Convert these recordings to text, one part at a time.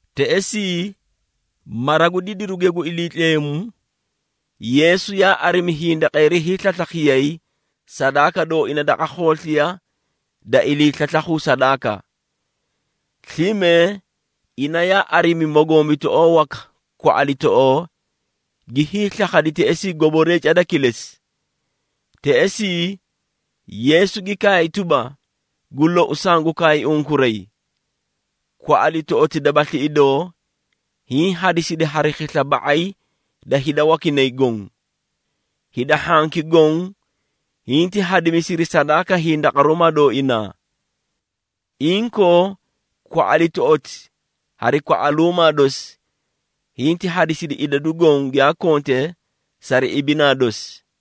Teꞌesii mara gu didiruge gu Iliitleemu, Yeesu yaa arimi hindaqeeri hiislaslakhiyay sadaaka dooina daqa khoosliya da iliislaslakhu sadaaka. Slime ina yaa arimi mogombitoꞌoo waka kwaꞌalitoꞌoo, gi hiislakhadi teꞌesii goboree cada kilesi. Teꞌesii, Yeesu gi kaay tuba, “Gu lou, sangu kaay unkuray, kwaꞌalitoꞌoti dabasli idoo, hiĩ hadisidi hari khisla ba⁄ay da hida wakinay goõ. Hida hhanki goõ, hinti hadisiri sadaaka hindaqaruumaa dooinaa. Inkoo, kwaꞌalitoꞌoti hari kwaꞌaluumaa dosi, hinti hadisidi idadu goõ, giyaa konte sari ibinaa dosi.”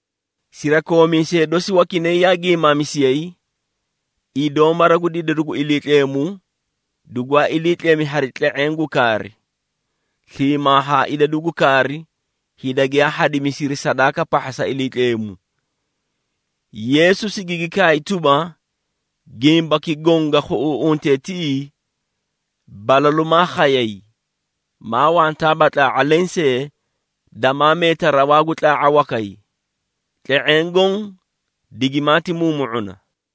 Sirakoomiisee dosi wakinay yaa giimaamisiyay, idoo mara gu didiru gu Iliitleemu dugwaa ilii tlemi hari tle⁄eẽ gu kaari, sliimaa haa idadu gu kaari hida giyaa hadimisiri sadaaka pahha sa Iliitleemu. Yeesu sigigi kaay tuba, “Gimbaki goõ ga khuꞌuuꞌuntee tiꞌii, balalu maa khayay, maa wantaaba tlaa⁄a lensee damaa meeta rawaa gu tlaa⁄a wakay. Tle⁄eẽ goõ digimaati muumu⁄una.”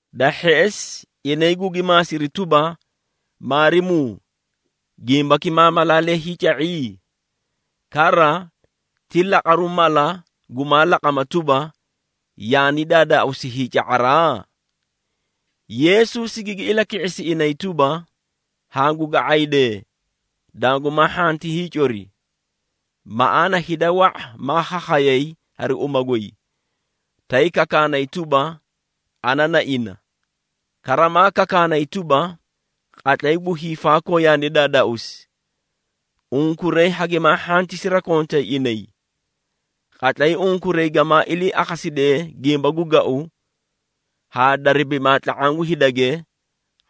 Da hheꞌesi, inay gugi maasiri tuba, “Maarimuu, gimbaki maa malaalee hiica⁄i? Kara, ti laqaru mala gumaa laqama tuba, yaani daadaauusi hiica⁄araa?” Yeesu sigigi ilaki⁄isi inay tuba, “Hangu ga⁄aydee, dangumaa hhanti hiicori. Maꞌaana hida wa⁄a maa khakhayay hari uma goy, tay kakaanay tuba, ‘Ana na ina,’ kara maa kakaanay tuba, ‘Qatlay gu hiifaakoo yaani daadaausi.’ Unkuray hagimaa hhanti sirakontay inay. Qatlay unkuray gamaa ilii akhasidee gimba gu gau haa darabimaa tla⁄aã gu hidage,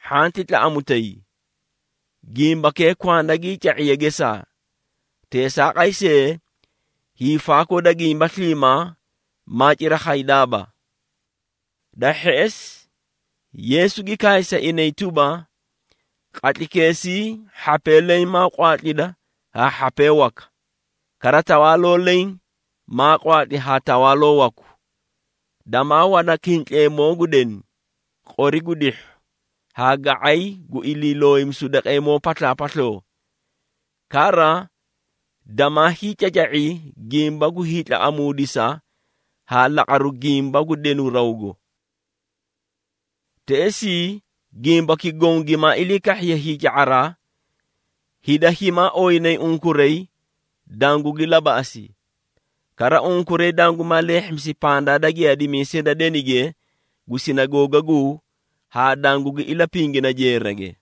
hhanti tlaꞌamutay. Gimbakee kwanda gii ca⁄iye gesaa. Teesaaqay see, hiifaakoo da gimba sliimaa maa cira khaydaaba.” Da hheꞌesi, Yeesu gi kaay sa inay tuba, “Qatlaykeesii hhapee leẽ maa qwaatlida haa hhapee waka, kara tawaaloo leẽ maa qwaatli haa tawaaloo waku. Damaa wana kintleemoo gu deni, qori gu dihhu haa ga⁄ay gu iliilooyimisu daqeemoo paslaapasloo. Kara, damaa hiicaca⁄i gimba gu hiitlaꞌamuudisa haa laqaru gimba gu denu rawgo. Teꞌesii, gimbaki goõ gimaa ilii kahhiye hiica⁄araa, hida himaa ooyinayi unkuray dangugi labaꞌasi. Kara unkuray dangumaa leehhimisi pandaa da giyaadimiisee da denige gu Sinagoogaguu haa dangugi ilapingina jeerage.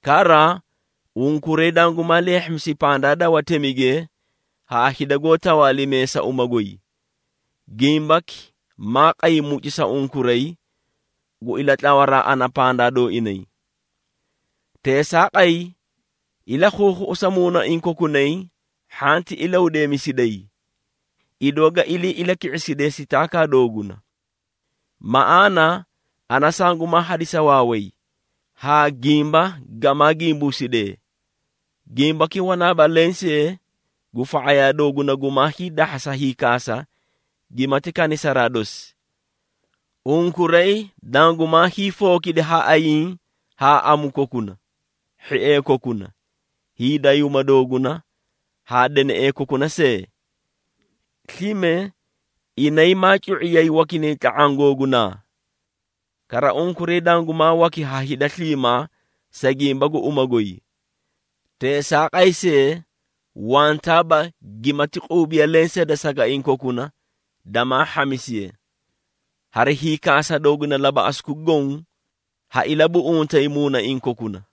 Kara, unkuray dangumaa leehhimisi pandaa da watemige haa hida goó tawaalimee sa uma goy. Gimbaki maa qay mucu sa unkuray, gu ilatlawaraa ana pandaa dooinay. Teesaaqay, ilakhuukhuꞌusa muunaiĩ kokunay hhanti ilahudeemisiday, idoo ga ilii ilaki⁄isidee sitaakaa dooguna. Maꞌaana, ana sangumaa hadisa waaway haa gimba gamaa gimbuusidee. Gimbaki wanaaba lensee gu fa⁄ayaa dooguna gumaa hiidahhasa hiikaasa gimati kanisaraa dosi. Unkuray dangumaa hiifookidi ha ayiĩ haa amu kokuna, hhiee kokuna, hiidayuuma dooguna haa deneꞌee kokuna see. Slime inay maa cu⁄iyay wakinay tla⁄aã googunaa. Kara, unkuray dangumaa waki ha hida sliimaa, sa gimba gu uma goy. Teesaaqay see, wantaaba gimati quubiya lensee da sagaiĩ kokuna damaa hhamisiye. Hari hiikaasa dooguna labaꞌasuki goõ, ha ilabuꞌuntay muunaiĩ kokuna.”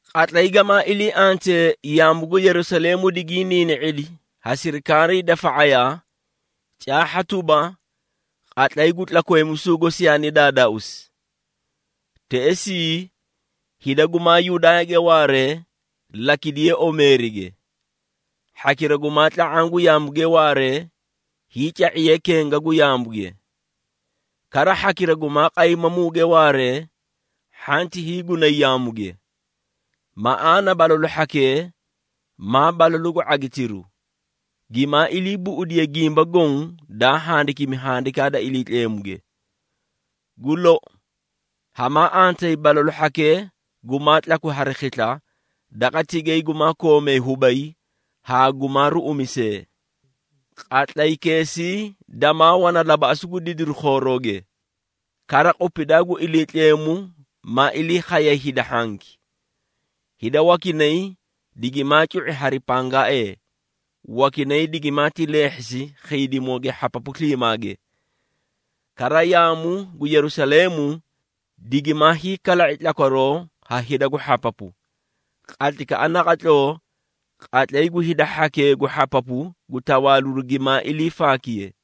“Qatlay gamaa ilii antee yaamu gu Yerusaleemu digiĩ niini⁄idi ha sirikaarii da fa⁄ayaa, caahha tuba, qatlay gu tlakweemisuu gosi yaani daadaauusi. Teꞌesii, hida gumaa Yudaayage waaree, lakidiyee omeerige. Hhakira gumaa tla⁄aã gu yaamuge waaree, hiica⁄iyee kenga gu yaamuge. Kara hhakira gumaa qaymamuge waaree, hhanti hiigunay yaamuge. Maꞌaana balalu hhakee maa balalu gu ⁄agitiru, gimaa ilii buꞌudiye gimba goõ daa handikimi Handikaa da Iliitleemuge. Gu lou, hamaa antayi balalu hhakee gumaa tlakwi hari khisla daqa tigay gumaa koomee hubay haa gumaa ruꞌumisee! Qatlaykeesii damaa wana labaꞌasu gu didiru khoorooge, kara qupidaa gu Iliitleemu maa ilii khay hida hhanki. Hida wakinay digimaati cu⁄i hari pangaaee, wakinay digimaati leehhisi khiidimooge hhapapu sliimaage. Kara yaamu gu Yerusaleemu digimaa hiikala⁄i tlakwaroo ha hida gu hhapapu, qatlaykaꞌa naqatloo qatlay gu hida hhakee gu hhapapu gu tawaaliru gimaa ilii faakiyee.”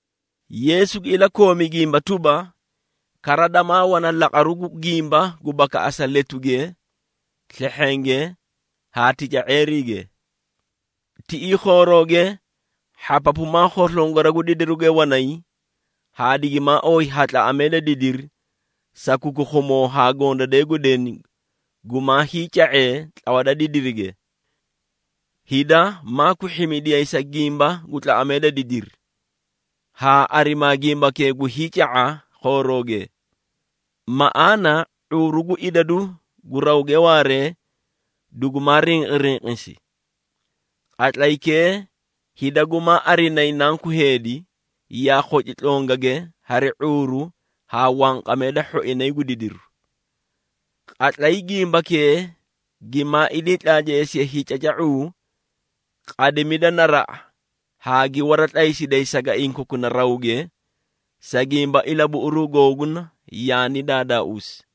Yeesu gi ilakoomi gimba tuba, “Kara, damaa wana laqaru gu gimba gu bakaꞌasa letuge, slehhenge haa tica⁄eeriige. Tiꞌii khoorooge, hhapapu maa khoslongora gu didiruge wanay haa digimaa ooyi ha tlaꞌamee da didiri, sa kukukhumoo haa gondadee gu deni gumaa hiica⁄ee tlawa da didirige. Hida maa kwihhimidiyay sa gimba gu tlaꞌamee da didiri, haa arimaa gimbakee gu hiica⁄a khoorooge. Maꞌaana ⁄uuru gu idadu gu rawge waaree, dugumaa rinqirinqisi. Qatlaykee, hida gumaa arinayi Nanku Heedi, yaa khoci tlongage hari ⁄uuru haa wanqamee da hhoinay gu didiru. Qatlay gimbakee gimaa ilii tlaatleesiye hiicaca⁄uu, qadimida naraꞌa haa gi waratlaysiday sagaiĩ kokuna rawaage, sa gimba ilabuꞌuruu googuna yaani daadaauusi.”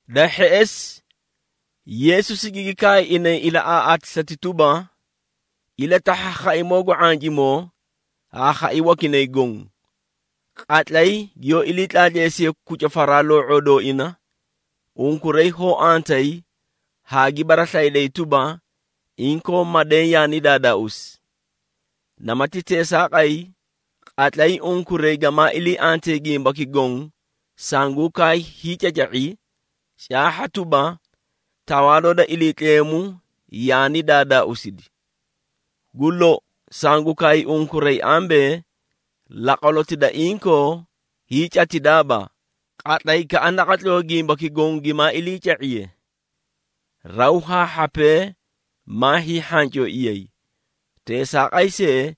Da hheꞌesi, Yeesu sigigi kaay inay ilaꞌaaꞌaatisati tuba, “Ilatahha khaimoo gu ⁄ancimoo haa khai wakinay goõ. Qatlay giyoó ilii tlaatleesiyee kucufaraa loo⁄oo dooina, unkuray hoó antayi haa gi baraslayidayi tuba, inkoo madeẽ yaani daadaauusi. Namati teesaaqay, qatlay unkuray gamaa ilii antee gimbaki goõ sanguũ kaay hiicaca⁄i, caahha tuba, Tawaaloo da Iliitleemu yaani daadaauusidi. Gu lou, sangu kaay unkuray ambee, laqwaloti da inkoo hiicatidaaba, qatlaykaꞌa naqatloo gimbaki goõ gimaa iliica⁄iye. Raw haa hhapee maa hiihhancooiyay. Teesaaqay see,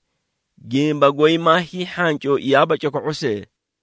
gimba goy maa hiihhancooiyaaba coko⁄o see.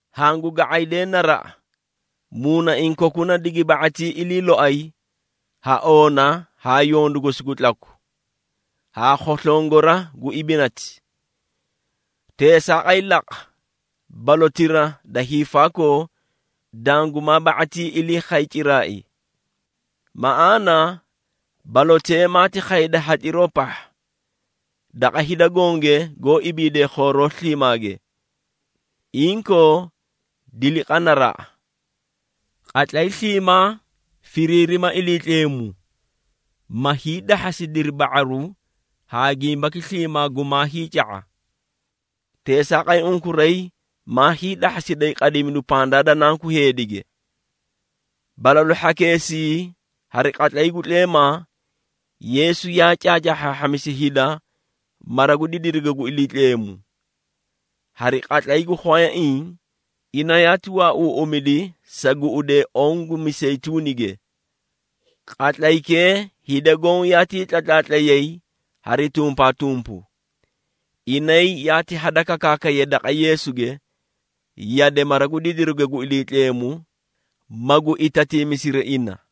Hangu ga⁄aydee naraꞌa, muunaiĩ kokuna digi ba⁄atii ilii loay ha oona haa yondu gosi gu tlaku, haa khoslongora gu ibinati. Teesaaqay laqa balotira da hiifaakoo dangumaa ba⁄atii ilii khay ciraai. Maꞌaana, balotee maati khayda hatliroo pahha, daqa hida gonge goó ibiidee khooroo sliimaage. Inkoo, diliqa naraꞌa. Qatlay sliimaa firiirima Iliitleemu, ma hiidahhasidiri ba⁄aru haa gimbaki sliimaa gumaa hiica⁄a. Teesaaqay unkuray maa hiidahhasiday qadimidu pandaa da Nanku Heedige.” Balalu hhakeesii hari qatlay gu tleemaa, Yeesu yaa caacaahhaahhamisi hida mara gu didiruge gu Iliitleemu. Hari qatlay gu khwayaiĩ ina yaati waauuꞌumidi sa guꞌudee oõ gu Miseyituunige. Qatlaykee, hida goõ yaatii tlatlaatlayay hari tumpaatumpu. Inay yaati hadakakaakayay daqa Yeesuge, yade mara gu didiruge gu Iliitleemu, magu itatiimisiri ina.